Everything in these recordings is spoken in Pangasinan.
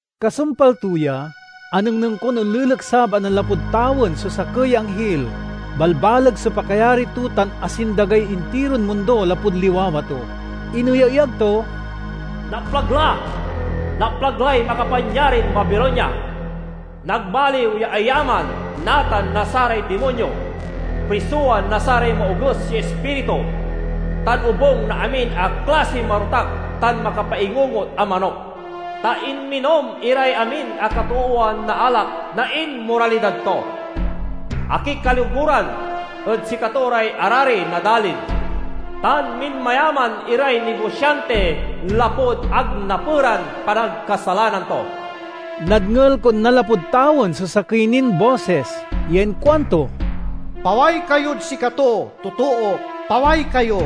Kasumpal to ya, anengneng kon onleleksab a nanlapud tawen so sakey ya anghil. Balbaleg so pakayari to tan asindagay intiron mundo lapud liwawa to. Ineyaeyag to, "Naplag la! Naplag lay makapanyarin Babilonia! Nagmaliw ya ayaman natan na saray dimonyo, prisowan na saray maoges ya ispiritu, tan obung na amin a klasiy marotak tan makapaingungot a manok. Ta inminom iray amin a katoowan na alak na inmoralidad to. Akikaloguran ed sikato ray arari na dalin, tan minmayaman iray nigosianti lapud ag naperan panagkasalanan to." Nadngel kon nanlapud tawen so sakey nin bosis ya inkuanto, "Paway kayod sikato, totook, paway kayo!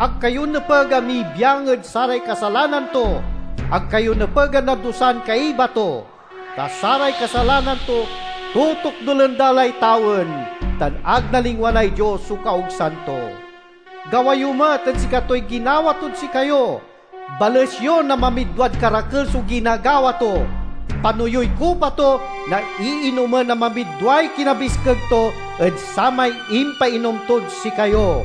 Ag kayo nepeg a mibiang ed saray kasalanan to; ag kayo nepeg a nadusan kaiba to! Ta saray kasalanan to totokdulen da lay tawen, tan ag nalingwanay Dios so kaogsan to. Gawa yo met ed sikatoy ginawa tod sikayo; bales yo na mamidwad karakel so ginagawa to. Pano yoy kupa to na iinomen a mamidway kinabiskeg to ed samay impainom tod sikayo.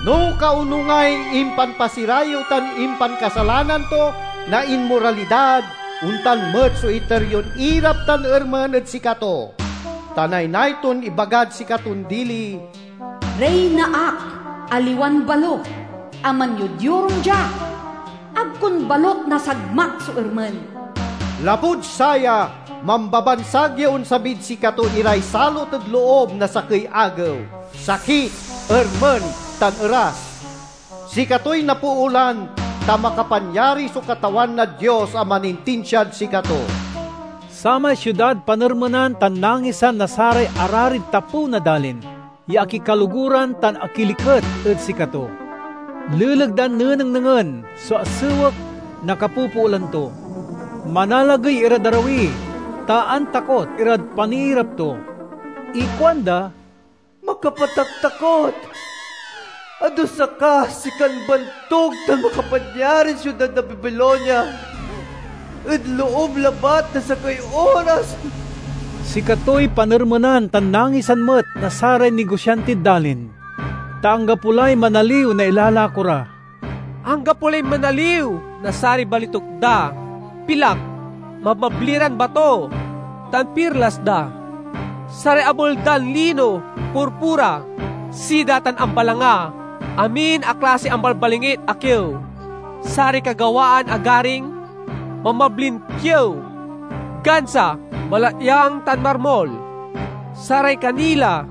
No kaonungay impanpasirayew tan impankasalanan to na inmoralidad, ontan met so iter yon irap tan ermen ed sikato. Ta naynay ton ibagad sikaton dili: 'Riyna ak, aliwan balo, a manyod-yorung dia! Ag kon balut nasagmak so ermen!' Lapud saya, mambabansag ya onsabid sikato iray salot ed loob na sakey agew: sakit, ermen, tan eras. Sikatoy napoolan, ta makapanyari so Katawan a Dios a manintinsiad sikato." Samay siudad panermenan tan nangisan na saray ararid tapew na dalin ya akikaloguran tan akiliket ed sikato, leleg dan nenengnengen so asewek na kapopoolan to. Manalagey irad arawi, ta antakot irad paniirap to. Ikuanda, "Makapataktakot! Adusa ka, sikan bantug tan makapanyarin siudad na Babilonia ed loob labat na sakey oras!" Sikatoy panermenan tan nangisan met na saray nigosiantid dalin, ta anggapo lay manaliw na ilalako ra. Anggapo lay manaliw na saray balituk da, pilak, mabmabli ran bato, tan pirlas da; saray abel dan lino, purpura, sida, tan ambalanga; amin a klasiy ambalbalingit a kiew; saray kagawaan a garing, mabmablin kiew, gansa, balatyang, tan marmul; saray kanila,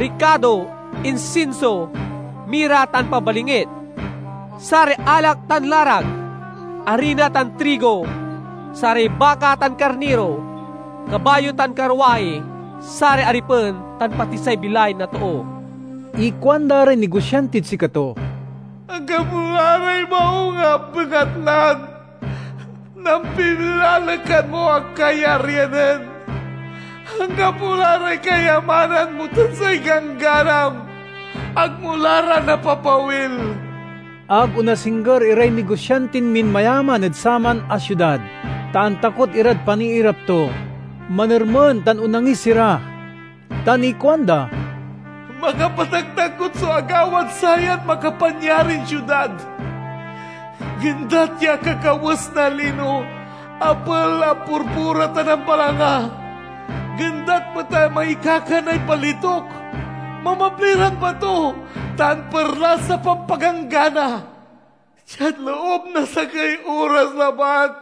rikado, insinso, mira, tan pabalingit; saray alak tan larak, arina tan trigo, saray baka tan karniro, kabayo tan karwahi, saray aripen, tan pati say bilay na too. Ikuanda ray nigosiantid sikato, "Anggapo la ray maung a bengatlan nampilalekan mo a kayaryanen. Anggapo la ray kayamanan mo tan say gangganam; ag mo la ra napapawil!" Ag onasingger iray nigosiantin minmayaman ed saman a siudad, ta antakot irad paniirap to. Manermen tan onangis ira, tan ikuanda: "Makapataktakot so agawad sayan makapanyarin siudad! Gendat ya akakawes na lino, abel a purpura tan ambalanga. Gendat met a mangikakanay balituk, mabmabli ran bato, tan pirlas a pampaganggana! Diad loob na sakey oras labat,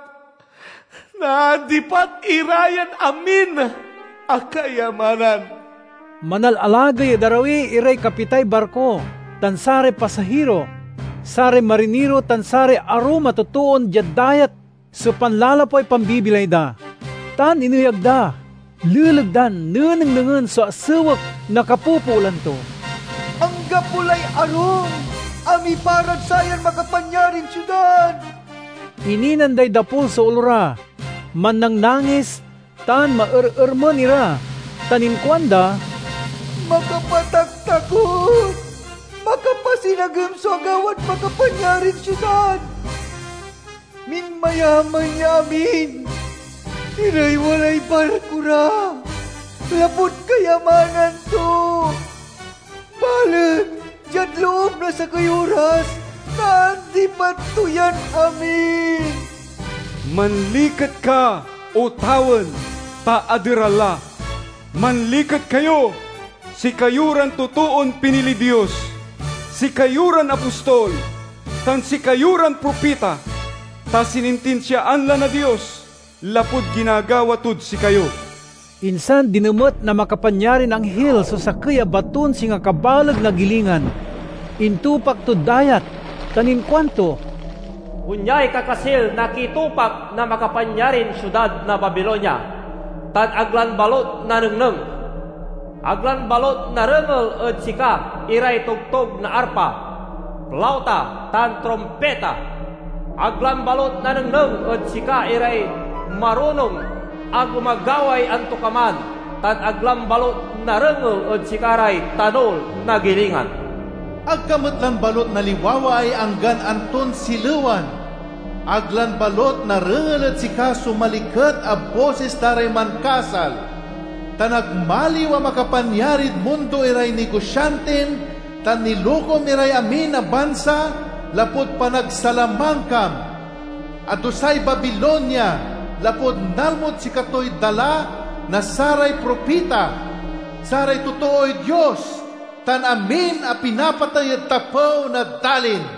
naandipat ira yan amin a kayamanan!" Manalalagey ed arawi iray kapitay barko tan saray pasahiro, saray mariniro tan saray arum a totoon diad dayat so panlalapway pambibilay da, tan ineyag da leleg dan nenengnengen so asewek na kapopoolan to, "Anggapo lay arum a miparad sayan makapanyarin siudad!" Ininan day dapul so olo ra, mannangnangis tan maerermen ira tan inkuanda, "Makapataktakot! Makapasinagem so agawad makapanyarin siudad! Minmayaman ya amin iray walay barko ra, lapud kayamanan to. Balet diad loob na sakey oras, naandipat to yan amin!" Manliket ka, O tawen, ta aderal la! Manliket kayo, sikayo ran totoon piniliy Dios, sikayo ran apostol, tan sikayo ran propita! Ta sinintinsiaan la na Dios lapud ginagawa tod sikayo! Insan dinemet na makapanyarin anghil so sakey a baton singa kabaleg na gilingan. Intupak tod dayat, tan inkuanto, "Onyay kakasil na kitupak na makapanyarin siudad na Babilonia, tan ag lan balut nanengneng! Ag lan balut narengel ed sika iray togtog na arpa, plauta, tan trumpita! Ag lan balut nanengneng ed sika iray marunong a gumagaway antokaman, tan ag lan balut narengel ed sika ray tanul na gilingan! Ag ka met lan balut naliwawaay anggan anton silewan; ag lan balut narengel ed sika so maliket a bosis da ray mankasal. Ta nagmaliw a makapanyarid mundo iray nigosiantim tan nilokom iray amin a bansa lapud panagsalamangkam!" Adusay Babilonia, lapud nalmod sikatoy dala na saray propita, saray totooy Dios, tan amin a pinapatey ed tapew na dalin.